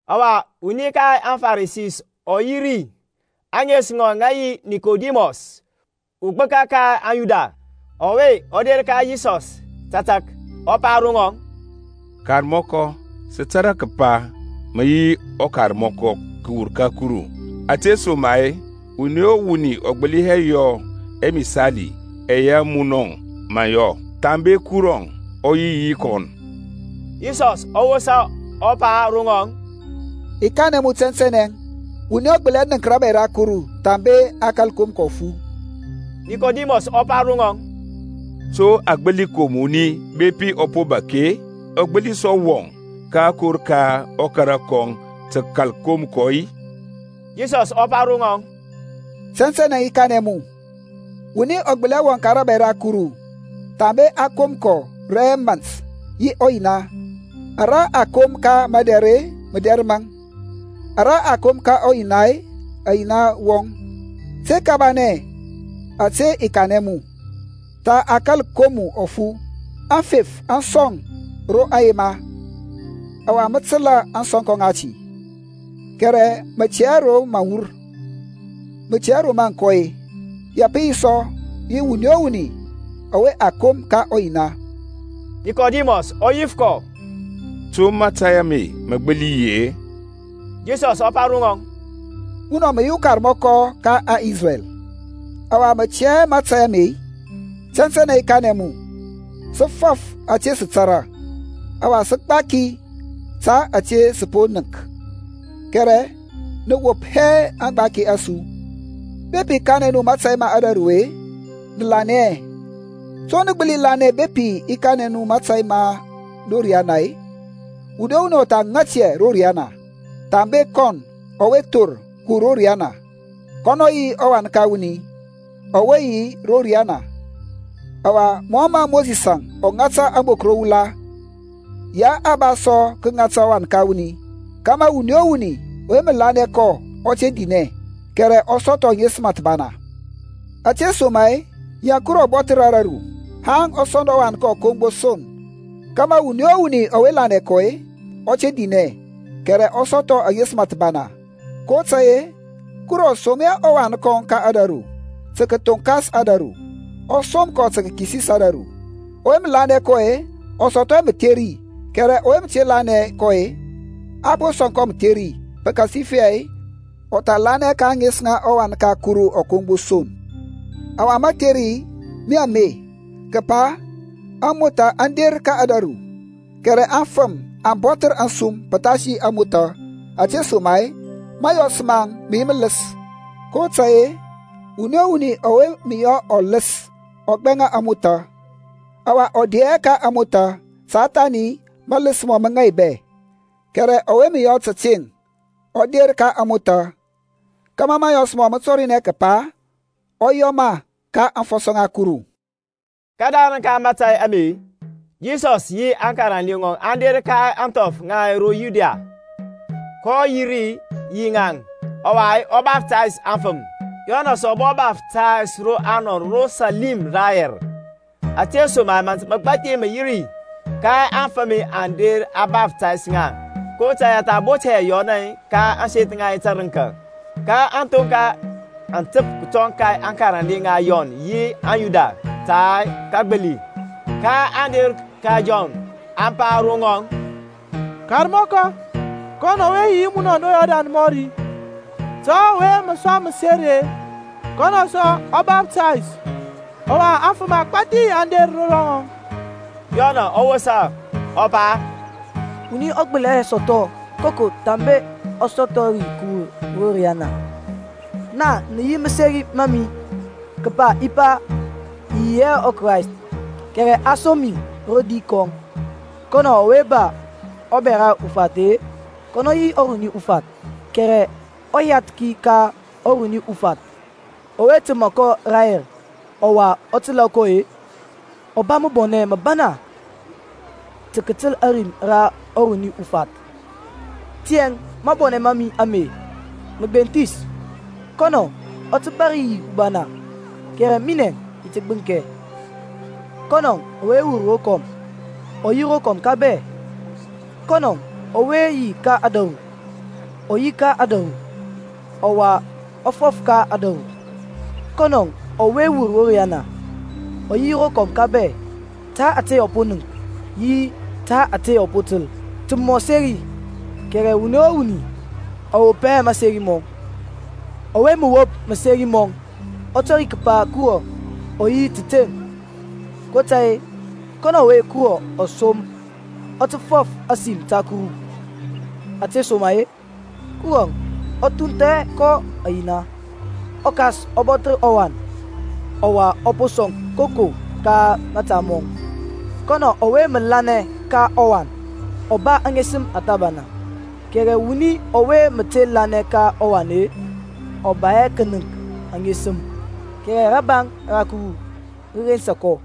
Ɔwa wuni ka aŋFarisi ɔ yi ri, ȧŋes ŋɔŋ ŋə yi Nikodimɔs ugbəka ka aŋYuda. Ɔwe ɔ der ka Yisɔs tȧtȧk, ɔ pa ro ŋɔŋ, Karmɔkɔ, sə tȧrȧ kəpa mə yi ukarmɔkɔ kəwur ka Kuru: ȧtesoma-e wuni o wuni ɔ gbəli hɛ yɔ ɛmisali ɛyɛ munɔ mə yɔ-e, thambe Kurɔŋ ɔ yi yi kɔn. Yisɔs ɔ wosa, ɔ pa ro ŋɔŋ, I kanɛ mu tɛntɛnɛ, wuni ɔ gbəli hɛ nənk rȧbȧy ra Kuru, thambe a kȧl kom kɔ ɔfu. Nikodimɔs ɔ pa ro ŋɔŋ, To a gbəli kom wuni bepi ɔ po bȧk-e? Ɔ gbəli sɔ wɔŋ ka akor ka ɔkara kɔŋ tə kəkal kom kɔ-i? Yisɔs ɔ pa ro ŋɔŋ, Tɛntɛnɛ, i kanɛ mu, wuni ɔ gbəli hɛ wɔŋ ka rȧbȧy ra Kuru, thambe a kom kɔ rɛ mȧnt yi ɔYina. Ara a kom ka madɛr mədɛr maŋ, ara a kom ka ɔYina uyina wɔŋ. Te kabanɛ ȧte i kanɛ mu, Tha a kȧl kom mu ɔfu. Aŋfef aŋ sɔŋ ro aŋ yema, ɔwa mə təlȧ ȧŋsɔnkɔ ŋati, kɛrɛ mə tɛ hɛ ro aŋ wur, mə tɛ hɛ ro mə aŋ kɔ-e; ya pə yi sɔ yi wuni o wuni ɔwe a kom ka ɔYina. Nikodimɔs ɔ yif kɔ, To mȧtȧy ame mə gbəli yi-e? Yisɔs ɔ pa ro ŋɔŋ, Munɔ mə yi ukarmɔkɔ ka aŋIsrɛl, ɔwa mə tɛ hɛ mȧtȧy ame-i? Tɛntɛnɛ i kanɛ mu, Sə fɔf ȧte sə tȧrȧ, ɔwa sə gbaki ta ȧte sə po nənk; kɛrɛ nə wop hɛ aŋgbaki a su. Bepi i kanɛ nu mȧtȧy ma ȧdȧru-e nə lanɛ hɛ, to mə nə gbəli lanɛ bepi i kanɛ nu mȧtȧy ma ro riana-e? Wuni o wuni ɔ tha ŋat hɛ ro riyana, thambe kɔn ɔwe thor kəwur ro riyana, kɔnɔ yi ɔWan ka wuni ɔwe yi ro riyana. Ɔwa mɔ mə Mosisȧŋ ɔ ŋata ȧŋbok ro wula, ya a ba sɔ tə kəŋata ɔWan ka wuni kȧmȧ wuni o wuni ɔwe mə lanɛ kɔ ɔ te dinɛ, kɛrɛ ɔ sɔthɔ aŋesəm thəbana. Ȧtesoma-e ya Kurɔŋ ɔ bɔthər ȧdȧru, haŋ ɔ sɔnd ɔWan kɔŋ ɔ kom gbo son, kȧmȧ wuni o wuni ɔwe lanɛ kɔ ɔ te dinɛ, kɛrɛ ɔ sɔthɔ aŋesəm thəbana. kotȧy-e Kuru ɔ som hɛ ɔWan kɔŋ ka ȧdȧru tə kəthoŋkas ȧdȧru, ɔ som kɔ tə kəkisis ȧdȧru. Ɔwe mə lanɛ kɔ-e ɔ sɔthɔ hɛ mətheri, kɛrɛ ɔwe te lanɛ kɔ-e, a po kɔ sɔŋ mətheri, pəkasifɛ ɔ tha lanɛ hɛ ka ȧŋes ŋa ɔWan ka Kuru ɔ kom gbo son. Ɔwa matheri mi ame, kəpa amotha aŋ der ka ȧdȧru, kɛrɛ afəm aŋ bɔthər asum pəthasi amotha, ȧtesoma-e mȧyɔs maŋ mə yi mələs. kotȧy-e wuni o wuni ɔwe mə yɔ ɔləs ɔ gbɛŋa ȧŋmothȧ, ɔwa ɔ de hɛ ka ȧŋmothȧ ta thani mələs mɔŋ mə ŋaibɛ. Kɛrɛ ɔwe mə yɔ tȧteŋ ɔ der ka ȧŋmothȧ, kȧmȧ mȧyɔs mɔŋ mə tɔrinɛ kəpa, ɔ yɔ ma ka aŋfɔsɔ ŋa Kuru. Kədarəŋ ka mȧtȧy ame, Yisɔsȧŋ yi aŋkarande ŋɔŋ aŋ der ka ȧŋthɔf ŋa ro Yudia: kɔ yi ri yi ŋaŋ, ɔwa ɔ baftays aŋfəm. Yɔnȧŋ sɔ ɔ bɔ baftays ro Anɔn ro Salim rayɛr, ȧtesoma-e mȧnt məgbathi mə yi ri; ka aŋfəm aŋ der, a baftays ŋa. kotȧy-e a tha bot hɛ Yɔnȧŋ ka ȧŋseth ŋa tərəŋka. Ka ȧthonka aŋ təp kətɔŋ ka aŋkarande ŋa Yɔn yi uYuda ta kəgbili. kaŋ der ka Yɔn, aŋ pa ro ŋɔŋ, Karmɔkɔ, kɔn ɔwe yi yi munɔŋ ro Yɔrdan mɔri, ta ɔwe mə sɔŋ məseri-e, kɔnɔ sɔ ɔ baftays, ɔwa afəm agbȧthi aŋ der ro ŋɔŋ. Yɔnȧŋ ɔ wosa, ɔ pa, Wuni ɔ gbəli hɛ sɔthɔ koko thambe ɔ sɔthɔ ri kəwur ro riyana. Naŋ nə yi maseri ma mi, kəpa i pa, I yi hɛ ɔKrayst, kɛrɛ a som mi rodi kɔŋ. Kɔnɔ ɔwe ba ɔbɛra ufath-e kɔnɔ yi ɔruni ufath: kɛrɛ ɔyathki ka ɔruni ufath, ɔwe təmȧ kɔ rayɛr ɔwa ɔ təlȧ kɔ-e, ɔ ba məbɔnɛ məbana ta kətəl ȧrim ra ɔruni ufath: tiyȧŋ mabɔnɛ ma mi ame mə gbenthis. Kɔnɔ ɔ tə bȧr yi ubana, kɛrɛ minɛŋ i ti gbəŋkɛ. Kɔnɔ ɔwe wur rokɔm ɔ yi rokɔm ka bɛ: kɔnɔ ɔwe yi ka ȧdȧru ɔ yi ka ȧdȧru, ɔwa ɔ fɔf ka ȧdȧru: kɔnɔ ɔwe wur ro riyana ɔ yi rokɔm ka bɛ. Ta ȧte ɔ po nənk yi ta ȧte ɔ po təl, tə mɔ seri, kɛrɛ wuni o wuni ɔ wop hɛ maseri mɔŋ. Ɔwe mə wop maseri mɔŋ ɔ tɔri kəpa Kurɔŋ ɔ yi təteŋ. kotȧy-e, kɔnɔ ɔwe Kuru ɔ som ɔ tə fɔf ȧsim ta Kuru: ȧtesoma-e Kurɔŋ ɔ thuntha hɛ kɔ ɔYina. ƆKas ɔ bɔthər ɔWan, ɔwa ɔ po sɔŋ koko ka mȧta mɔŋ. Kɔnɔ ɔwe mə lanɛ ka ɔWan ɔ ba aŋesəm thəbana: kɛrɛ wuni ɔwe mə te lanɛ ka ɔWan-e, ɔ ba hɛ kənəŋk aŋesəm; kɛrɛ rabaŋ ra Kuru rə rensa kɔ.